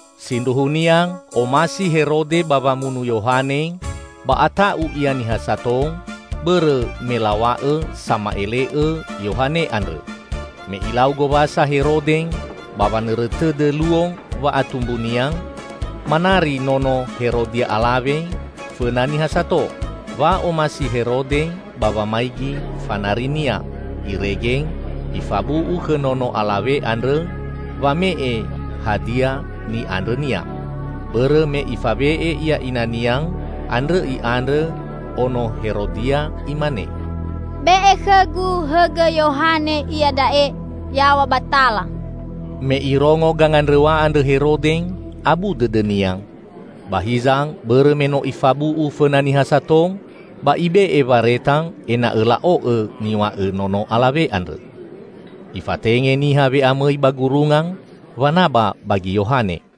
Sindruhunia omasi Herode ba wamunu Yohane, ba ata'u ia niha sato, bõrõ me law̃a'õ sama'ele'õ Yohane andrõ. Me ilau gowasa Herode ba wanõrõ tõdõ luo wa'atumbunia, manari nono Herodia alawe fõna niha sato. Wa'omasi Herode ba wamaigi fanarinia, irege ifabu'u khõ nono alawe andrõ wame'e hadia ni'andrõnia! Bõrõ me ifawe'e ia inania, andrõ i'andrõ ono Herodia imane, "Be'e khõgu hõgõ Yohane iada'e yaw̃a ba tala!" Me irongo gangandrõw̃a andrõ Herode, abu dõdõnia. Ba hiza, bõrõ me no ifabu'u fõna niha sato, ba ibe'e wareta ena'õ la'o'õ niw̃a'õ nono alawe andrõ. Ifatenge niha we'amõi ba gurunga wanaba bagi Yohane.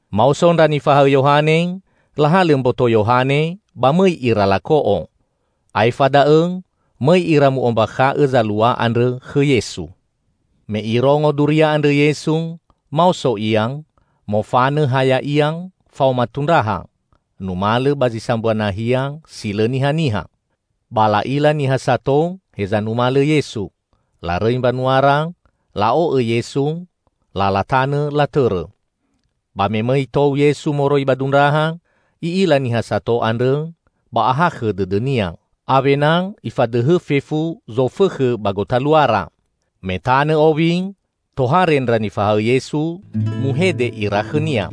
Maoso ndra nifahaõ Yohane lahalõ mboto Yohane ba mõi ira lako'o. Aefa da'õ mõi ira mu'ombakha'õ zalua andrõ khõ Yesu. Me Irongo duria andrõ Yesu, maoso Ia, mofanõ ha Ya'ia faoma tundraha, numalõ ba zi sambua nahia si lõ nihaniha. Ba la'ila niha sato heza numalõ Yesu. Larõi mbanuara, la'o'õ Yesu, lala tanõ latõrõ. Ba me mõi tou Yesu moroi ba dundraha, I'ila niha sato andrõ, ba ahakhõ dõdõ-Nia. Awena Ifadõhõ fefu zofõkhõ ba gotaluara. Me tanõ owi, tohare ndra nifahaõ Yesu, muhede ira khõ-Nia,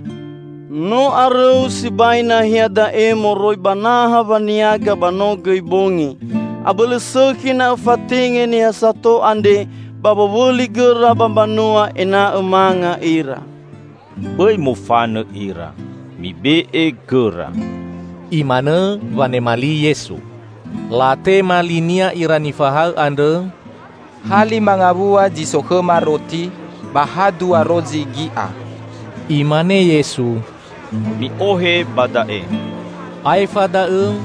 "No arõu sibai nahia da'e moroi ba naha waniaga ba no gõi bongi. Abõlõ sõkhi na Õfatenge niha sato andre ba wowõli gõra ba mbanua ena'õ manga ira." "Bõi mofanõ ira, mibe'e gõra," Imanõ wanema li Yesu. Latema li-Nia ira nifahaõ andrõ, "Ha lima ngawua zi so khõma roti ba ha dua rozi gi'a!" Imane Yesu, "Mi'ohe ba da'e." Aefa da'õ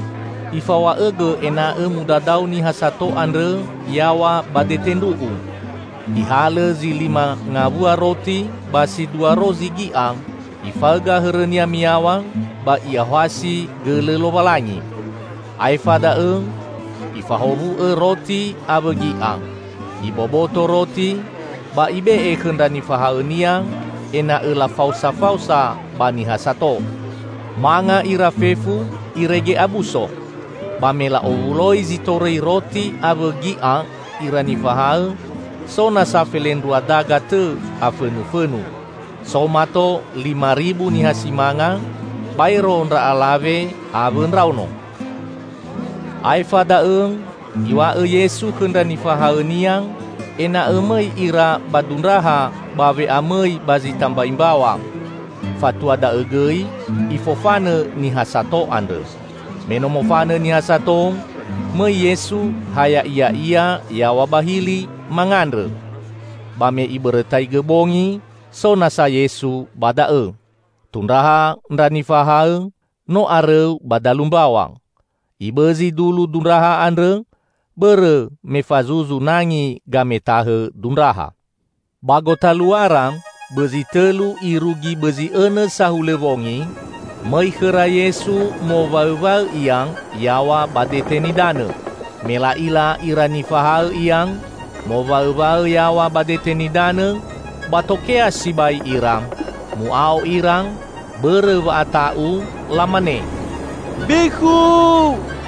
Ifaw̃a'õgõ ena'õ mudadao niha sato andrõ yaw̃a ba dete ndru'u. Ihalõ zi lima ngawua roti ba si dua rozi gi'a, Ifaõga hõrõ-Nia miyaw̃a, ba I'aohasi gõlõ Lowalangi. Aefa da'õ Ifahowu'õ roti awõ gi'a. Iboboto roti ba Ibe'e khõ ndra nifahaõ-Nia ena'õ lafaosafaosa ba niha sato. Manga ira fefu irege abuso. Ba me la'owuloi zi torõi roti awõ gi'a ira nifahaõ, so nasa felendrua daga tõ afõnufõnu. So mato lima ribu niha si manga, baero ndra alawe awõ ndraono. Aefa da'õ Iw̃a'õ Yesu khõ ndra nifahaõ-Nia ena'õ mõi ira ba dundraha ba we'amõi ba zi tambai mbaw̃a, fatua da'õ gõi Ifofanõ niha sato andrõ. Me no mofanõ niha sato, mõi Yesu ha Ya'iya'ia yaw̃a ba hili, mangandrõ. Ba me ibõrõtaigõ bongi, so nasa Yesu ba da'õ. Tundraha ndra nifahaõ no arõu ba dalu mbaw̃a. Ibõzi dulu dundraha andrõ bõrõ me fazuzu nangi gametahõ dundraha. Ba gotaluara bõzi tõlu irugi bõzi õnõ sahulõ wongi, mõi khõra Yesu mowaõwaõ Ia yaw̃a ba dete nidanõ. Me la'ila ira nifahaõ Ia, mowaõwaõ yaw̃a ba dete nidanõ, ba tokea sibai ira. Mu'ao ira bõrõ wa'ata'u, lamane, "Bekhu!"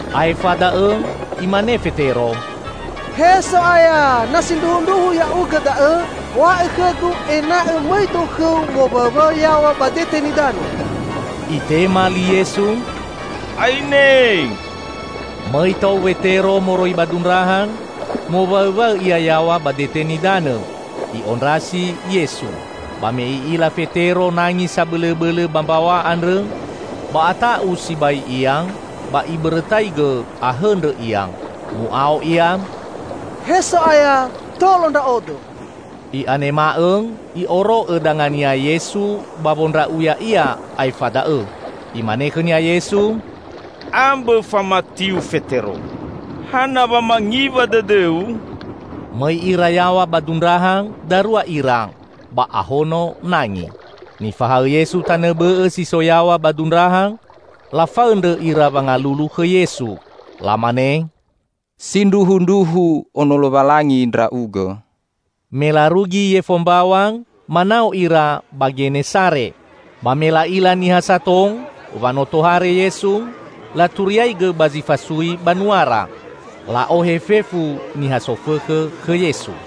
Aefa da'õ imane Fetero, "He So'aya, na sindruhundruhu Ya'ugõ da'õ, w̃a'õ khõgu ena'õ mõido khõ-U mowaõwaõ yaw̃a ba dete nidanõ." Itema li Yesu, "Aine." Mõi tou Wetero moroi ba dundraha, mowaõwaõ ia yaw̃a ba dete nidanõ, i'ondrasi Yesu. Ba me i'ila Fetero nangi sabõlõbõlõ ba mbaw̃a andrõ, ba ata'u sibai ia, ba ibõrõtaigõ ahõndrõ ia. Mu'ao ia, "He So'aya, tolo ndra'odo!" I'anema'õ I'oro'õ danga-Nia Yesu ba wondra'u ya'ia aefa da'õ. Imane khõnia Yesu, "Ambõ famatiu, Fetero. Hana wa mangiwa dõdõu?" Mõi ira yaw̃a ba dundraha darua ira, ba ahono nangi. Nifahaõ Yesu tanõ bõ'õ si so yaw̃a ba dundraha lafaõndrõ ira wangalulu khõ Yesu. Lamane, "Sindruhundruhu ono Lowalangi Ndra'ugõ!" Me larugi yefo mbaw̃a, manao ira ba Genesare. Ba me la'ila niha sato wa no tohare Yesu, laturiaigõ ba zi fasui banuara. La'ohe fefu niha sofõkhõ khõ Yesu.